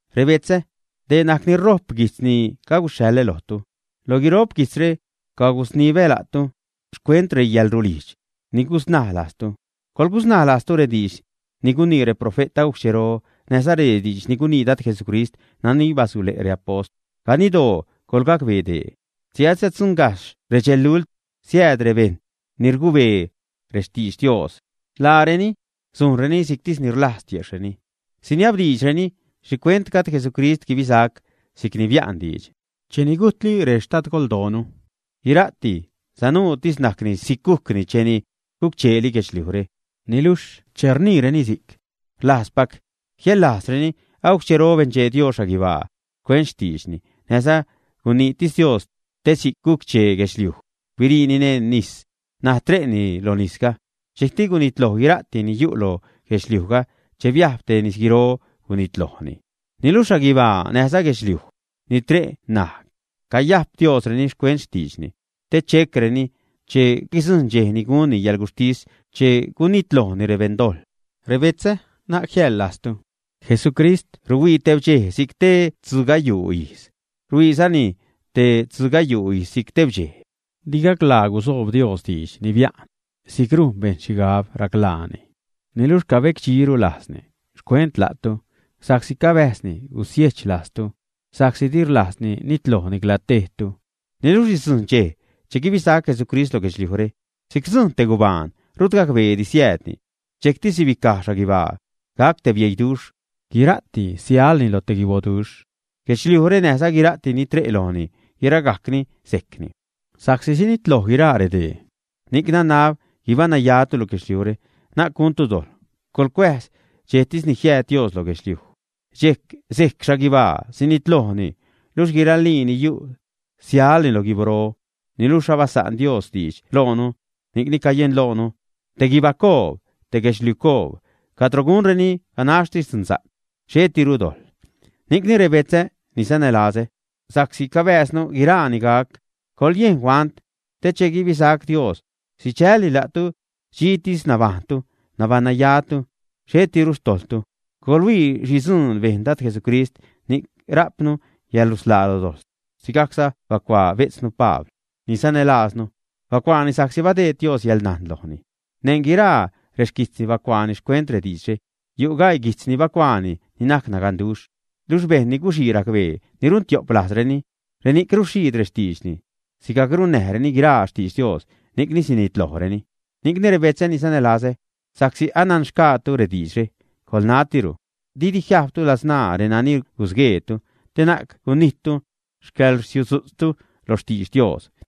Rebetzä, dee najc ni rojp guijtz ni caguxhaḻä lojtu; lo guiro'p guijtzre cagusnibä la'tu xcuent reyäḻrulijdx ni gusnaj lajztu. Coḻgusnaj lajztu rediidx ni gunii reprofe't agujc xchero, näjza rediidx ni gunii Dad Jesucrist nani basule' reapost. Ganiddoo, coḻgacbee dee: che asiäddzuṉgajxh redxelult, siääd rebejṉ ni rgubee rextidx Dios, laareni sujnreni si'ctis ni rlajz tiejxhreni. Siniabdiidxreni: “¿Xhicuent gajd Jesucrist guibisac si'cni bia'n diidx? Cheni gujtli rextadgoldoonu, guira'ti sanuutis najcni si'c gujcni cheni guc-cheeli guedxliujre.” Niluxh che rniireni si'c, rlajzpac jiäḻlajzreni agujc xchero benchee Dios xhaguibaa xcuent xtiidxtisni, näjza guniitis Dios te si'c guc-chee guedxliuj, biriini neṉ nis, ṉaj tre'ni loj nisga. Dxejcti gunitloj guira'ti ni yu' lo guedxliujga che biajb te nisguiro, gunitlojni. Niluxh xhaguibaa näjza guedxliuj ni tre' ṉaj, cayajp Diosreni xcuent xtiidxni te checreni che guidzujṉ dxej ni gunni yäḻguxhtis, che gunitlojni rebeṉdojḻ. Rebetzä, na'c jiäḻlajztu, Jesucrist ruhuii tebdxej si'c te tzugayuu ijz, rhuiizani te tzugayuu ijz si'c tebdxej. Di gaclaa gusoob Dios diidx ni bia'n, si'c rujn bejṉ xhigab raclaani, niluxh cabecdxiru lajzni xcuent la'tu, sa'csi cabäjzni gusiejch lajztu, sa'csi di rlajzni nitloj nicla tejtu. Niluxh sidzujṉ dxej che guibisac Jesucrist lo guedxliujre si'c rdzujṉ te gubaan, rut gacbeedi siäädni. Dxejcti sibicaj xhaguibaa, gac te bieiduxh, guira'ti sialni lo te guiboduxh, guedxliujre näjza guira'ti ni tre' lojni, guiragajcni sejcni. Sa'csi sinitloj guiraa redee, ni'c nanab guibaṉnayatu lo guedxliujre, na'c guntu dojḻ. Coḻcuäjz dxejtis ni jiääd Dios lo guedxliuj. Dxejc sejc xhaguibaa, sinitlojni, luxh guiralii ni yu' sialni lo guiboro. Niluxh abasa'n Dios diidx loonu, ni'cni cayenloonu te guibacoob, te guedxliucoob, cadro gunreni ganaxtis dzunsa'c, xhetiru dojḻ. Ni'cni rebetzä ni sanälazä, sa'csi cabääznu guiraa ni gac, coḻyejn huant te che guibisac Dios, sidxälni la'tu dxitis nabajṉtu, nabaṉnayatu, xhetiru xtojḻtu. Coḻhuii xhi dzuun bejn Dad Jesucrist ni'c rajpnu yäḻrusḻaa lo dojḻ. Sigajcza bacuaa bejtznu Pabl ni sanälajznu. Bacuaani sa'csi badeed Dios yäḻnajn lojni. Neṉ guiraa rexquijtzni bacuaani xcuent rediidxre. Yu' gaii guijtz ni bacuaani ni najc naganduxh. Luxh bejṉ ni guxii racbee, ni runtio'p lajzreni, reni'c ruxhiid rextiidxni, sigajc runnäjreni guiraa xtidx Dios, ni'cni sinitlojreni. Ni'cni rebetzä ni sanälazä, sa'csi ananxgaatu rediidxre, coḻnatiru didi jiajbtu ladzṉaa renani gusgueetu, te na'c gunijttu xcäḻrsiudzu'tztu lo xtidx Dios.